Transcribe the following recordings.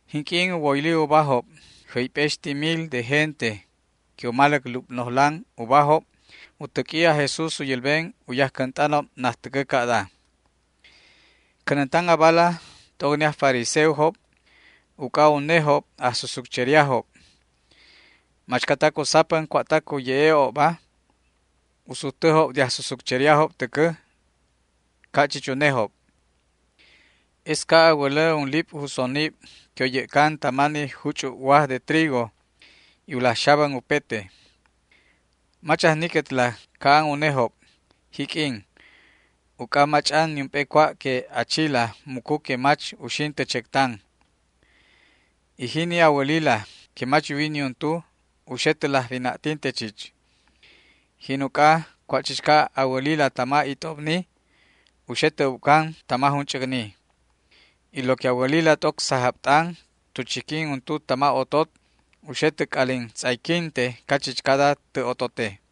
Jinq'uin u woyli ubajob jäyp'exti mil de gente que u maläc lubnojlan ubajob, u täq'ui aj Jesús u yälben u yajcänt'anob najtäcä ca'da: ―Cänäntan abala t'oc ni aj fariseojob uc'a unejob ajsusutcheriajob. Machcatac u sapän cua'tac u ye'e'obba u sujtäjob de ajsusutcheriajob täcä ca' chich an unejob. Es ca' a wälä unlip' jusonib que u yä'can tama ni juch'ub waj de trigo y u laj xabän upete. Mach ajniquetla ca' an unejob, jiq'uin, uc'a mach'an niump'e cua' que a chila mucu que mach uxin tä chectan, y jini a wälila que mach yuwi niuntu u xe tä laj wina'tinte chich. Jin uc'a cua' chichca a wälila tama it'obni u xe tä ubcan tama junch'äcni, y lo que a wälbila t'oc sajab t'an tu chiquin untu tama otot u xe tä c'alin tz'ayquinte cachichcada tä otote.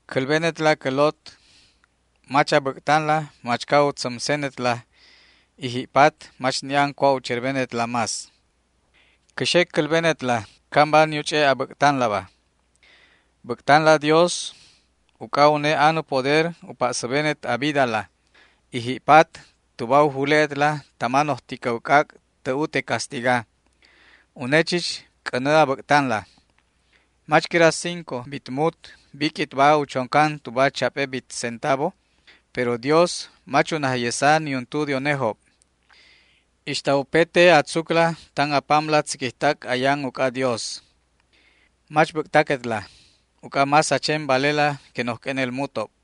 ’Cälbenetla cä lot, mach a bäc'tanla machca u tzämsenetla y ji'patba mach ni' an cua' u cherbenetla más. Cä xe cälbenetla camba ni u ch'e' a bäc'tanlaba. Bäc'tanla Dios, uc'a une an u poder u pa'säbenet a vidala, y ji'pat tuba u jule'etla tama noj ticäw c'ac' tä ute castiga. Une chich c'änä a bäc'tanla. ’¿Mach quira cinco bit mut biq'uitba u choncan tuba chap'e bit centavo? Pero Dios mach u najyesa niuntu de unejob. Ixta a tzucla tan a pamla tziquijtac ayan uc'a Dios upete. Mach bäc'taquetla, uc'a más a chen valela que noj q'uenel mutob.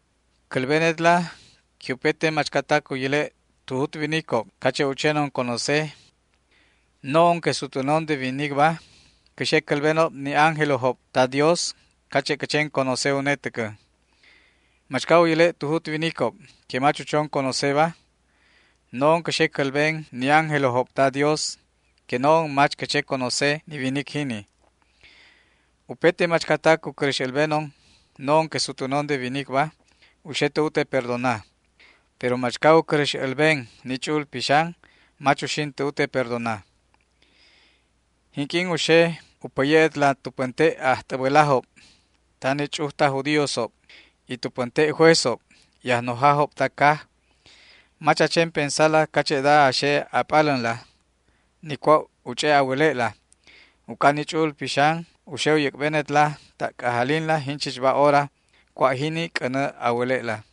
’Cälbenetla que upete machcatac u yäle' tu jut winicob cache' u chenon conoceba, no'onba que sutwänon de winicba cä xe cälbenob ni ángelojob ta Dios cache' cä chen conoce une täcä. Machca u yäle' tu jut winicob que mach u chon conoceba, no'on cä xe cälben ni ángelojob ta Dios que no'on mach cä che conoce ni winic jini. ’Upete machcatac u cäräx älbenon no'on que sutwänon de winicba u xe tä ute perdona, pero machca u cäräx älben ni Ch'u'ul Pixan mach uxin tä ute perdona. ’Jinq'uin u xe u päye'etla tu pänte' ajt'äbälajob tama ni ch'uj taj judíosob, y tu pänte' juezob y ajnojajob ta caj, mach a chen pensala cache'da a xe a p'alänla, ni cua' u ch'e' a wäle'la. Uc'a ni Ch'u'ul Pixan u xe u yäc'benetla ta' c'ajalinla jinchichba hora cua' jini c'änä a wäle'la.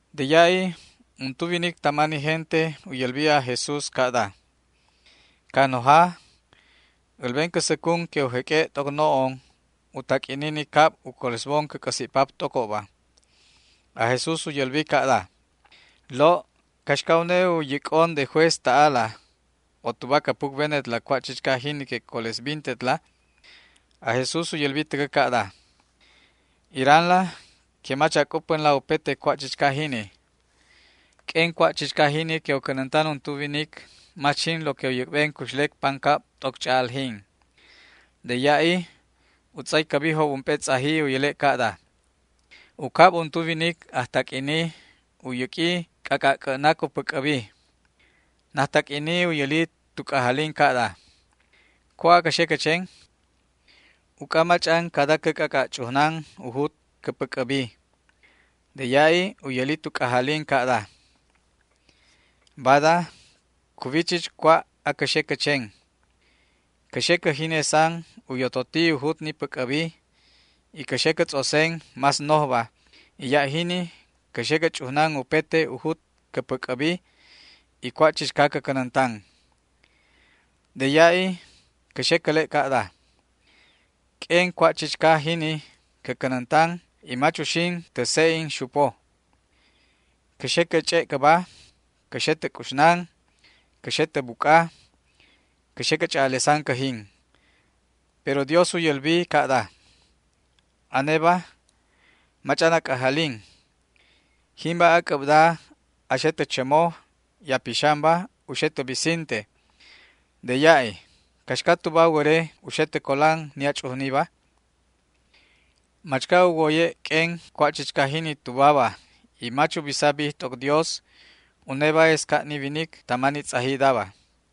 De ya'i untu winic tama ni gente u yälbi aj Jesús ca'da: ―Cajnoja, älben cä säcun que u jeq'ue' t'oc no'on u taq'uini ni cab u colesbon cä c'äsi' pap t'ocobba. Aj Jesús u yälbi ca'da: ―Lo', ¿caxca une u yäc'on de juez ta'ala o tuba cä pucbenetla cua' chichca jini que colesbintetla? Aj Jesús u yäli täcä ca'da: ―Iranla que mach a c'upänla upete cua' chichca jini. Q'uen cua' chichca jini que u cänäntan untu winic mach jin lo que u yäc'ben cuxlec pancab t'oc ch'a'aljin. De ya'i u tz'aycäbijob ump'e tz'aji u yäle' ca'da: ―U cab untu winic ajtaq'uini u yäq'ui c'ac'a' c'ä'nac u päc'äbi. Najtaq'uini u yäli tu c'ajalin ca'da: “¿Cua' acä xe cä chen? Uc'a mach'an cada cä c'ac'a' ch'ujnan u jut cä päc'äbi”. De ya'i u yäli tu c'ajalin ca'da: “Bada cuwi chich cua' acä xe cä chen. Cä xe cä jinesan u yototi u jut ni päc'äbi y cä xe cä tz'osen más nojba, y ya' jini cä xe cä ch'ujnan upete u jut cä päc'äbi y cua' chichca cä cänäntan. De ya'i cä xe cäle' ca'da: Q'uen cua' chichca jini cä cänäntan y mach uxin tä se'en xupo. Cä xe cä ch'e' cäba, cä xe tä c'uxnan, cä xe tä buc'a, cä xe cä ch'a'alesan cäjin”. Pero Dios u yälbi ca'da: “Aneba mach'an a c'ajalin. Jimba ac'äbda a xe tä chämo y a pixanba u xe tä bisinte. De ya'i ¿caxca tuba wäre u xe tä colan ni a ch'ujniba?” Machca u woye' q'uen cua' chichca jini tubaba y mach u bisa bij t'oc Dios, uneba es ca' ni winic tama ni tz'ajidaba.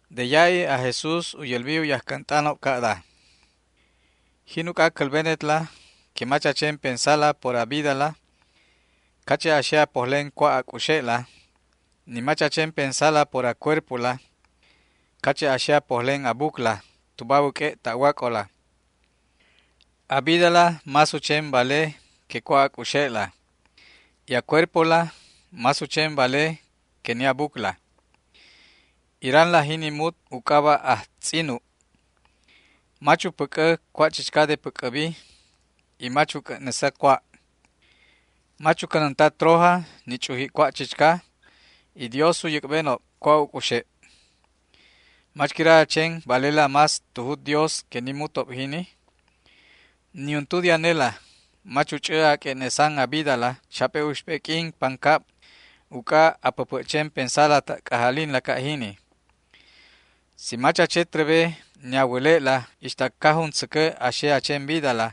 De ya'i aj Jesús u yälbi u yajcänt'anob ca'da: ―Jin uc'a cälbenetla que mach a chen pensala por a vidala, cache' a xe a pojlen cua' a c'uxe'la; ni mach a chen pensala por a cuerpola, cache' a xe a pojlen a bucla tuba a wäq'ue' ta'wac'olaba. A vidala más u chen vale que cua' a c'uxe'la y a cuerpola más u chen vale que ni a bucla. Iranla jini mut u c'aba' ajtz'inub, mach u päc'ä cua' chichca de päc'äbi y mach u c'ä'nesa cua'. Mach u cänänta troja ni ch'uji' cua' chichca y Dios u yäc'benob cua' u c'uxe'. ¿Mach quira a chen valela más tu jut Dios que ni mutob jini? Niuntu de anela mach u ch'ä a q'ue'nesan a vidala chap'e uxp'e q'uin pancab uc'a a päpä' chen pensa ta' c'ajalinla ca' jini. Si mach a che trebe ni a wäle'la ixta ca jun tzäcä a xe a chen vidala,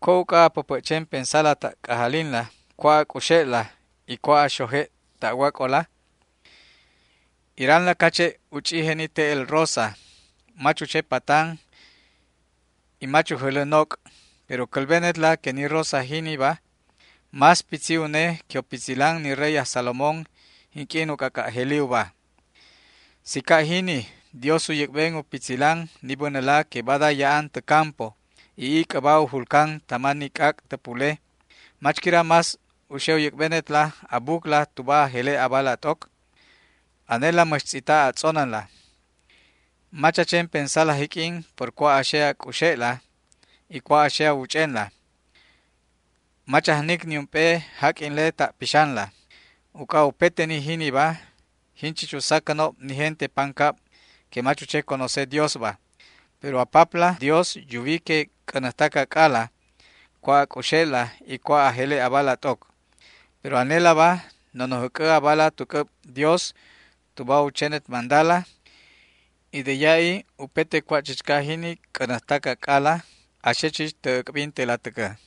¿cua' uc'a a päpä' chen pensa ta' c'ajalinla cua' a c'uxe'la y cua' a xoje' ta'wac'ola? ’Iranla cache' u ch'ije ni te'el rosa, mach u che patan y mach u jälä noc', pero cälbenetla que ni rosa jiniba más pitzi une que u pitzilan ni rey aj Salomón jinq'uin u c'ac'a' jeli uba. Si ca' jini Dios u yäc'ben u pitzilan ni bänäla que bada ya'an tä campo y ic'äba u julcan tama ni c'ac' tä pule, ¿mach quira más u xe u yäc'benet a bucla tuba a jele' abala t'oc? Anela mäx tz'ita' a tz'onänla. Mach a chen pensala jiq'uin, por cua' a xe a c'uxe'la y cua' a xe a wuch'enla. Mach ajnic niump'e jaq'uinle ta' pixanla. Uc'a upete ni jiniba, jin chich u sacänob ni gente pancab que mach u che conoce Diosba, pero a Papla Dios yuwi que c'änäjtac ac'ala cua' a c'uxe'la y cua' a jele' abala t'oc. Pero anelaba, nonoj äc'ä abala tu c'äb Dios tuba u chenet mandala, y de ya'i upete cua' chichca jini c'änäjtac ac'ala a xe chich tä äc'bintela täcä.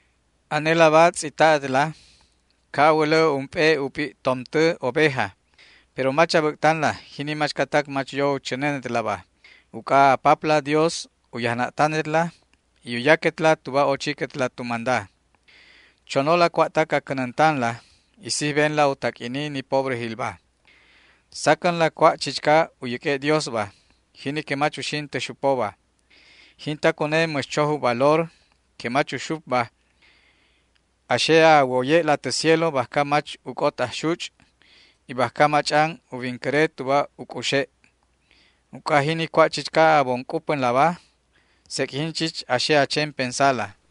’Anelaba tz'ita'etla, ca' a wälä ump'e u p'i' tomtä oveja, pero mach a bäc'tanla jini machcatac mach yo u chänenetlaba, uc'a a Papla Dios u yajna'tanetla y u yaquetla tuba ochiquetla tu manda. Chonola cua'tac a cänäntanla y sijbenla u taq'uini ni pobrejilba. Sacänla cua' chichca u yäq'ue' Diosba, jini que mach uxin tä xupoba. Jintac une mäx choj u valor que mach uxupba a xe a woye'la tä cielo bajca mach uc'ot ajxuch' y bajca mach'an u wincäre tuba u c'uxe'. Uc'a jini cua' chichca a bon c'upänlaba, sec' jin chich a xe a chen pensala.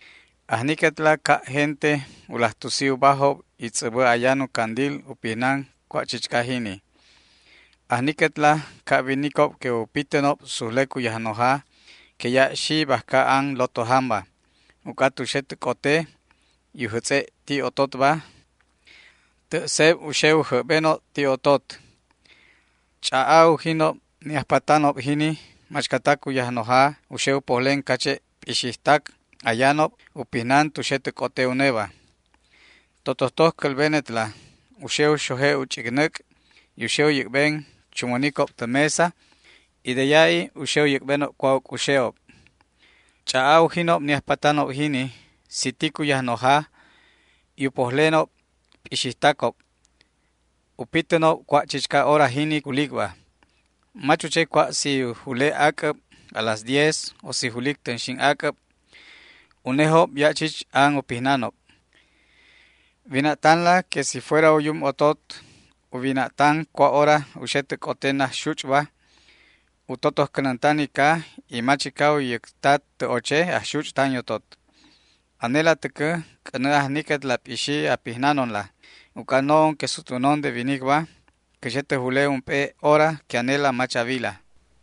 ’Ajniquetla ca' gente u laj tusi ubajob y tz'äbä ayan u candil u pijnan cua' chichca jini. Ajniquetla ca' winicob que u pitänob sujlec u yajnoja que ya' xi bajca an lotojanba, uc'a tu xe tä c'oteba y u jätz'e' ti' ototba, tä' seb u xe u jäbbenob ti' otot. Ch'a'a ujinob ni ajpatanob jini machcatac u yajnoja u xe u pojlen cache' p'ixijtac ayanob u pijnan tu xe tä c'ote uneba. Totojtoj cälbenetla u xe u xoje' u ch'icnäc' y u xe u yäc'ben chunwänicob tä mesa y de ya'i u xe u yäc'benob cua' u c'uxe'ob. Ch'a'a ujinob ni ajpatanob jini si tic u yajnojajob y u pojlenob p'ixijtacob u pitänob cua' chichca hora jini que julicba. Mach u che cua' si u jule ac'äb a las diez o si julic tänxin ac'äb, unejob ya' chich an u pitänob. Wina'tanla que si fuera u yum otot u wina'tan cua' hora u xe tä c'ote najxuch'ba, u totoj cänäntan ica y mach ica u yäcta tä oche ajxuch' tan yotot. Anela täcä c'änä ajniquetla p'ixi a pijnanonla, uc'a no'on que sutwänon de winicba cä xe tä jule ump'e hora que anela mach a wila.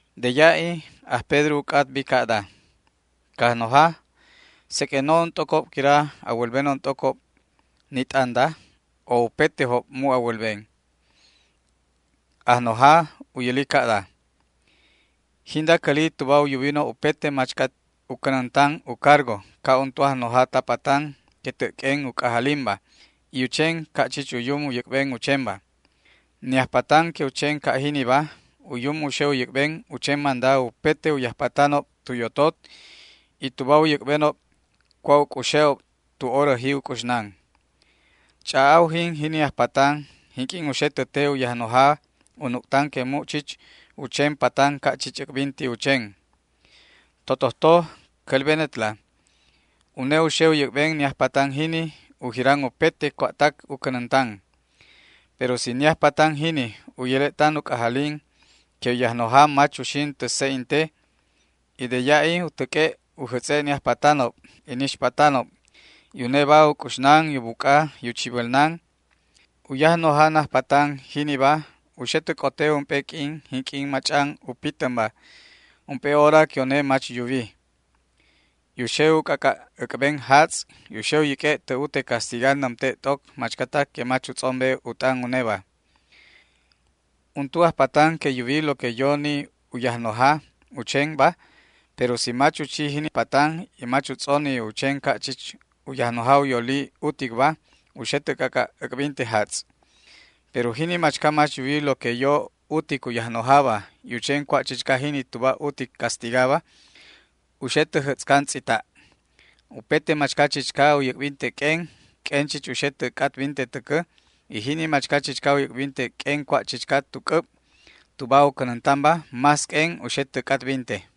De ya'i aj Pedro u c'atbi ca'da: ―Cajnoja, ¿seq'uen no'on t'ocob quira a wälbenon t'ocob ni t'anda, o upetejob mu' a wälben? Cajnojala u yäli ca'da: ―Jinda cäli tuba u yubinob upete machca u cänäntan u cargo ca' untu ajnoja ta patan que tä' q'uen u c'ajalinba y u chen ca' chich u yum u yäc'ben u chenba. Ni ajpatan que u chen ca' jiniba u yum u xe u yäc'ben u chen manda upete u yajpatanob tu yotot y tuba u yäc'benob cua' u c'uxe'ob tu horäji c'uxnan. Ch'a'a ujin jini ajpatan jinq'uin u xe tä te u yajnoja u nuc'tan que mu' chich u chen patan ca' chich äc'binti u chen. Totojtoj cälbenetla, une u xe u yäc'ben ni ajpatan jini u jiran upete cua'tac u cänäntan. Pero si ni ajpatan jini u yäle' tan u c'ajalin que u yajnoja mach uxin tä se'en te, y de ya'i u täq'ue' u jätz'e' ni ajpatanob y ni ixpatanob, y uneba u c'uxnan y u buc'a y u chibälnan, u yajnoja najpatan jiniba u xe tä c'ote ump'e q'uin jinq'uin mach'an u pitänba, ump'e hora que une mach yuwiba, y u xe u c'ac'a' äc'ben jatz' y u xe u yäq'ue' tä ute castiga nämte' t'oc machcatac que mach u tz'ombe u t'an uneba. ’Untu ajpatan que yuwi lo que yo ni U yajnoja u chenba, pero si mach u chi jini patan y mach u tz'oni u chen ca' chich u yajnoja u yoli uticba, u xe tä c'ac'a' äc'binte jatz'. Pero jini machca mach yuwi lo que yo utic u yajnojaba, y u chen cua' chichca jini tuba utic castigaba, u xe tä jätz'can tz'ita'. Upete machca chichca u yäc'binte q'uen, q'uen chich u xe tä c'atbinte täcä y jini machca chichca u yäc'binte q'uen cua' chichca tu c'äb tuba u cänäntanba, más q'uen u xe tä c'atbinte.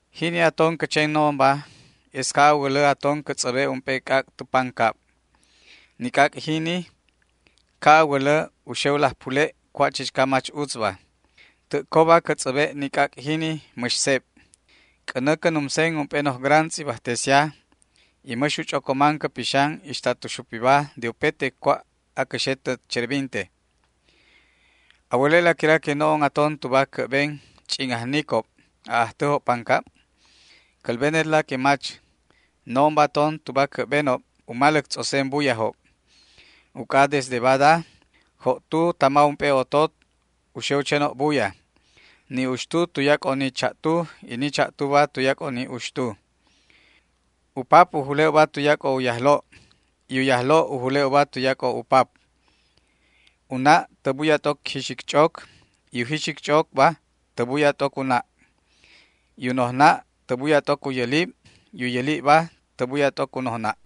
’Jini aton cä chen no'onba es ca' a wälä aton cä tz'äbe' ump'e c'ac' tu pancab. Ni c'ac' jini ca' a wälä u xe u laj pule' cua' chichca mach utzba. Tä' coba cä tz'äbe' ni c'ac' jini mäx seb. C'änä cä numsen ump'e noj gran tz'ibajtesia y mäx u ch'ocoman cä pixan ixta tu xupiba de upete cua' acä xe tä cherbinteba. ¿A wäle'la quira que no'on aton tuba cä'ben ch'in ajnicob a'ajtäjob pancab? Cälbenetla que mach, no'onba aton tuba cä'benob u maläc tz'osen buyajob. Uc'a desde badaba cincojob tan ump'e otot u xe u chenob buya, ni uxtuba tuyac'o ni cha'tu y ni cha'tuba tuyac'o ni uxtu. U pap untu u jule' uba tuyac'o u yajlo', y u yajlo'ba tä buya t'oc u pap; u na' untu tä buya t'oc jixic ch'oc y u jixic ch'ocba tä buya t'oc u na'; y u nojna' untu tä buya t'oc u yälib y u yälibba tä buya t'oc u nojna'.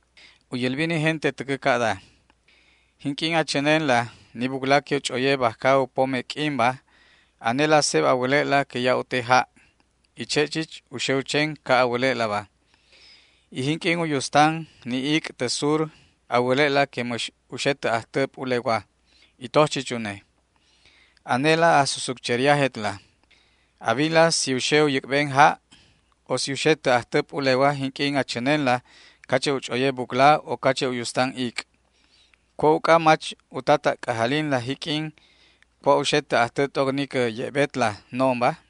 U yälbi ni gente täcä ca'da: ―Jinq'uin a chänenla ni bucla que u ch'oye bajca u pome q'uinba anela seb a wäle'la que ya' u te ja', y che' chich u xe u chen ca' a wäle'laba. Y jinq'uin u yustan ni ic' tä sur a wäle'la que mäx u xe tä ajtä p'ulewa, y toj chich une. Anela ajsusutcheriajetla. A wila si u xe u yäc'ben ja' o si u xe tä ajtä p'ulewa jinq'uin a chänenla cache' u ch'oye bucla o cache' u yustan ic'. ¿Cua' uc'a mach uta ta' c'ajalinla jiq'uin cua' u xe tä ajtä t'oc ni cä ye'betla no'onba?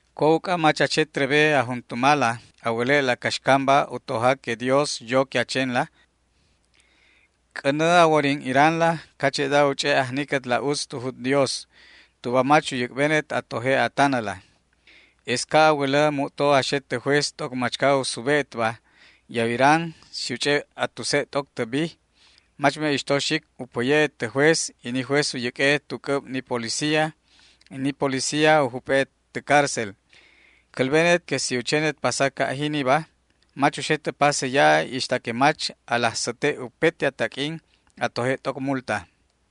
’¿Cua' uc'a mach a che trebe a juntumala a wäle'la caxcamba u toja que Dios yo que a chenla? C'änä a worin iranla cache'da u ch'e' ajniquetla utz tu jut Dios tuba mach u yäc'benet a toje' a tanäla. Es ca' a wälä mu'to a xe tä juez t'oc machca u sube'etba y a wiran si u ch'e' a tuse' t'oc tä bij, mach me'ixto xic u päye'et tä juez y ni juez u yäq'ue'et tu c'äb ni policía y ni policía u jup'e'et tä cárcel. Cälbenet que si u chenet pasa ca' jiniba mach uxet tä pase ya'i ixta que mach a laj säte' upete a taq'uin a toje' t'oc multa.